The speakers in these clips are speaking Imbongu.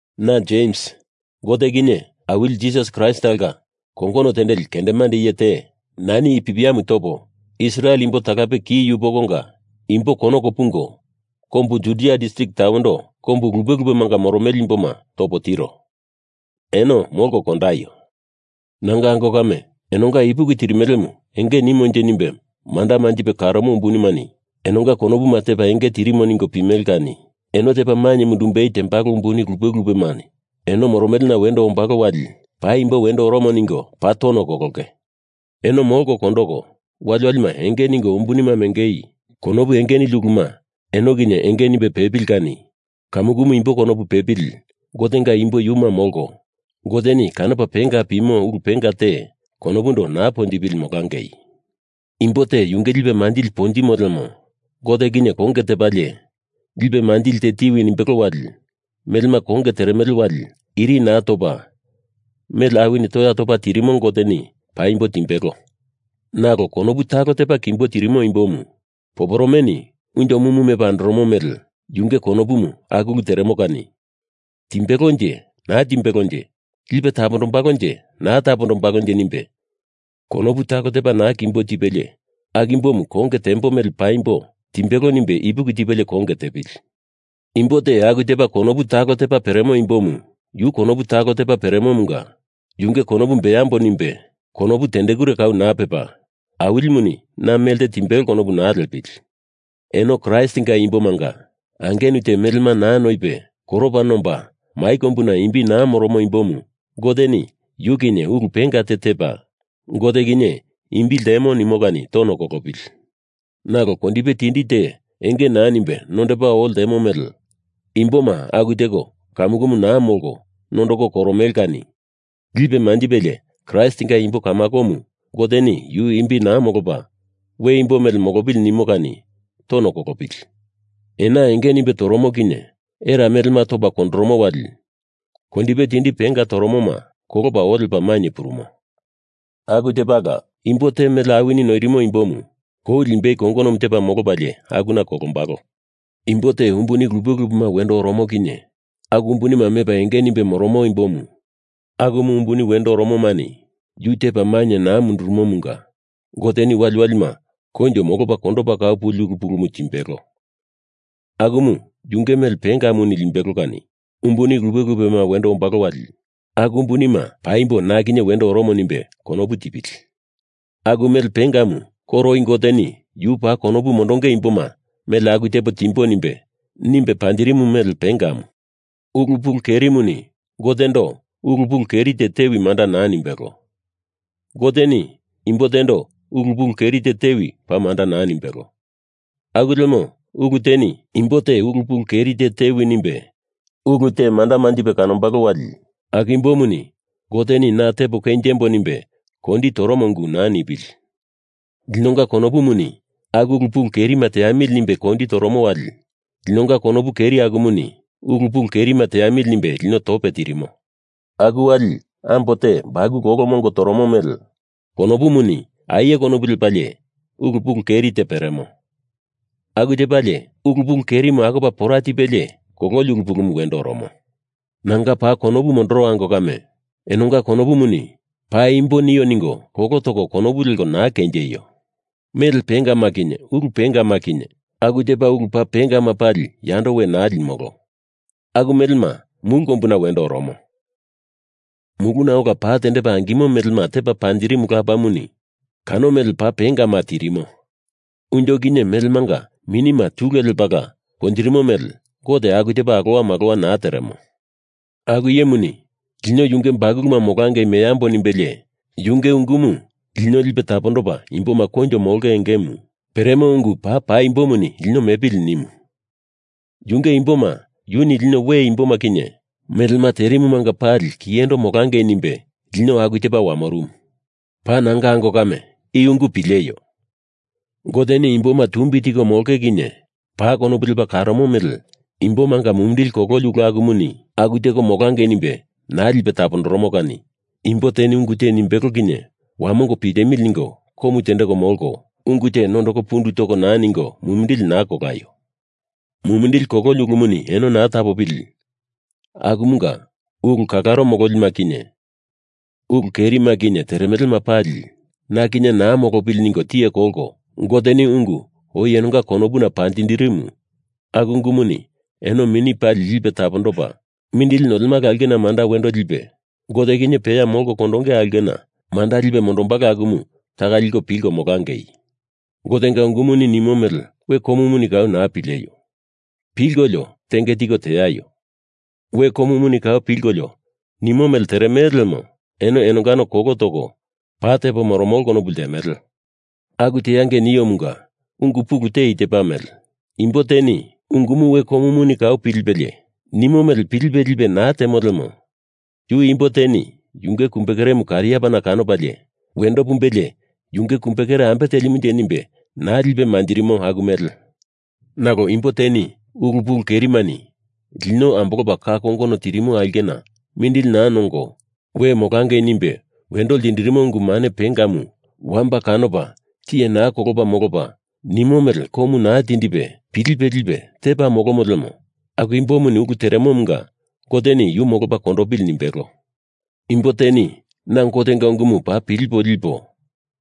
Na Jems, Gote kinye Awili Jisas Kraist talonga kongono tendeli kendemande iye te, nani i pipiamu topo, Israel imbo talape ki yupokonga imbo konoko pungo kombu Judia distrik tawendo kombu lupe lupemanga moromele imboma topo tiro. Eno molko kondaio! Nanga ango kame, enonga ipuki tirimelemu enge nimonje nimbe manda manjipe karomo umbunimani enonga konopuma tepa enge tirimo ningo pimele kani eno tepa mainye mundumbei tembalo umbuni lupe lupema eno moromelena wendo ombalo wali paimbo wendo oromo ningo paa tono kolongei. Eno molko kondoko, waliwalima enge ningo umbunima meangei konopu enge nili uluma eno kinye enge nimbe pepili kani kamukumu imbo konopu pepili Gotenga imbo yuma molko, Goteni kanopa penga pimo ulu penga te konopundo naa ponjipili molangei. Imbo te yunge lipe manjili ponjimo lemo Gote kinye konge tepalie lipe manjili te tiwi nimbelo wali melema konge teremele wali iri naa topa mele awini toya topa tirimo Goteni paimbo timbelo. Nalo konopu talo tepa kimbo tirimo imbomu, poporomeni unjo mumu mepa andoromo mele, yunge konopumu aku ulu teremo kani timbelonje naa timbelonje, lipe tapondombalonje naa tapondombalonje nimbe konopu talo tepa naa kimbo tipelie aku imbomu konge tembo mele paimbo timbelo nimbe ipuki tipelie konge tepili. Imbo te aku tepa konopu talo tepa peremo imbomu yu konopu talo tepa peremomunga yunge konopumu beambo nimbe, konopu tendekure kau naa pepa Awilimuni na melte timbelo konopu naa liepili. Eno Kraistinga imbomanga angenu te melema naa noipe koropa nomba mai kombuna imbi naa moromo imbomu Goteni yu kinye ulu penga te tepa, Gote kinye imbi ltemo nimo kani tono kolopili. Nalo kondipe tindi te enge naa nimbe nondopa oo ltemo mele imboma aku teko kamukumu naa molko nondoko koromele kani lipe manjipelie Kraistinga imbo kamakomu Goteni yu imbi naa molopa we imbo mele molopili nimo kani tono kolopili. Ena enge nimbe toromo kinye era melema topa kondoromo wali kondipe tindi penga toromoma kolopa oo lepa mainye purumo. Aku tepala imbo te mele awini noirimo imbomu kou limbei kongonomu tepa molopalie akuna kolombalo. Imbo te umbuni lupe lupema wendo oromo kinye aku umbunima mepa enge nimbe moromo imbo akumu umbuni wendo oromomani yu tepa mainye naa mundurumomunga Goteni waliwalima koinjo molopa kondopa kau puli ulu pulumu timbelo, akumu yunge mele pengamu limbelo kani umbuni lupe lupema wendo ombalo wali aku umbunima paimbo na kinye wendo oromo nimbe konopu tipili. Aku mele pengamu koro oi Goteni Yu paa konopu mondonge imboma mele aku tepo timbo nimbe, nimbe panjirimu mele pengamu. Ulu pulu kerimuni Gotendo ulu pulu keri te tewi manda naa nimbelo. Goteni imbo tendo ulu pulu keri te tewi paa manda naa nimbelo. Aku lemo ulu teni imbo te ulu pulu keri te tewi nimbe ulu te manda manjipe kanombalo wali aku imbomuni Goteni na tepo kenjembo nimbe kondi toromo ungu naa nipili. Linonga konopumuni aku ulu pulu kerima teamili nimbe kondi toromo wali linonga konopu keri akumuni ulu pulu kerima teamili nimbe lino tope tirimo. Aku wali ambo te bakulu olo mongo toromo mele konopumuni aie konopu lepalie ulu pulu keri te peremo. Aku tepalie ulu pulu kerimu akopa pora tipelie kololi ulu pulumu wendo oromo. Nanga paa konopu mondoro ango kame, enonga konopuni paimbo nio ningo kolo toko konopu leko naa kenjeio. Mele pengama kinye ulu pengama kinye, aku tepa ulu paa pengama pali yando we naa limolo. Aku melema mulu kombuna wendo oromo. Muluna ola pa tendepa angimo melema tepa panjirimu Lapamuni kano mele paa pengama tirimo. Unjo kinye melemanga minima tule lepala ponjirimo mele Gote aku tepa alowa malowa naa teremo. Aku iyemuni lino yunge bakuluma molangei meambo nimbelie yunge ungumu, lino lipe tapondopa imboma koinjo molonge engemu peremo ungu paa paimbomuni lino mepili nimu. Yunge imboma yuni lino we imboma kinye melema terumanga pali kiyendo molangei nimbe lino aku tepa wamorumu. Paa nanga ango kame, i ungu pileio! Goteni imboma tumbi tiko molonge kinye paa konopu lepa karomo mele imbomanga mumindili kololi ulu akumuni aku teko molangei nimbe naa lipe tapondoromo kani imbo teni ungu te nimbelo kinye wamongo pilemili ningo komu tendeko molko, ungu te nondoko pundu toko naa ningo, mumindili naa kolaio. Mumindili kololi ulumuni eno naa tapopili akumunga ulu kalaro mololima kinye ulu kerima kinye teremelema pali na kinye naa molopili ningo tiye kolko, Goteni ungu oi enonga konopumanga panjindirimu, aku ungumuni eno mini pali lipe tapondopa mindili nolemala aulkena manda wendo lipe Gote kinye peya molko kondonge aulkena manda lipe mondombalo akumu taka liko pilko molangei. Gotenga ungumuni nimo mele we komuni kau naa pileio! Pilkolio tenge tiko teaio. We komuni kau pilkolio nimo mele teremele lemo eno enongano kolo toko paa tepo moromolo konopu ltemele. Aku teangei niomunga ungu pulu te i tepa mele: Imbo teni ungumu we komuni kau pilipelie, nimo mele pilipe lipe naa temo lemo yu imbo teni yunge kumbekeremu kariapana kanopalie wendo pumbelie yunge kumbekere ambe telimunje nimbe naa lipe manjirimo aku mele. Nalo imbo teni, ulu pulu kerimani lino ambolopa ka kongono tirimo aulkena mindili naa nongo we molangei nimbe wendo ltindirimo ungu mane pengamu wamba kanopa tiye naa kolopa molopa, nimo mele komu naa tindipe pilipe lipe tepa molomo lemo aku imbomuni ulu teremomunga Goteni yu molopa kondopili nimbelo. Imbo teni na Gotenga ungumu paa pilipo lipo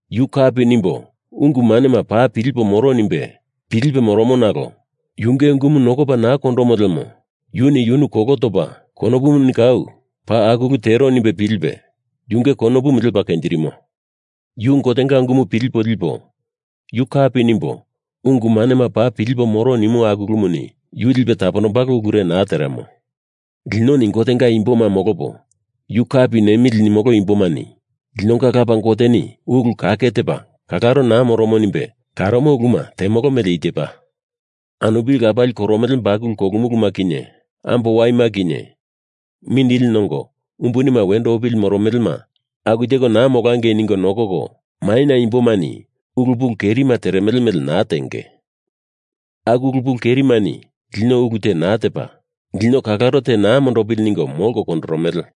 yu kapi nimbo ungu manema paa pilipo moro nimbe pilipe moromo nalo yunge ungumu nokopa naa kondomo lemo yuni yunu kolo topa konopuni kau paa aku ulu tero nimbe pilipe, yunge konopumu lepa kenjirimo. Yu Gotenga ungumu pilipo lipo, yu kapi nimbo ungu manema paa pilipo moro nimo ulu akumuni yu lipe tapondombalo ulure naa teremo. Linoni Gotenga imboma molopo yu kapi nemili nimolo imbomani linonga Lapa Goteni ulu kake tepa kalaro naa moromo nimbe karomo uluma temolo mele i tepa: Anupili lapali koromele bakulu kolumuluma kinye, ambo waima kinye, mindili nongo umbunima wendo opili moromelema aku teko naa molangei ningo nokoko, maina imbomani ulu pulu kerima teremele mele naa tenge. Aku ulu pulu kerimani lino ulu te naa tepa, lino kalaro te naa mondopili ningo molko kondoromele.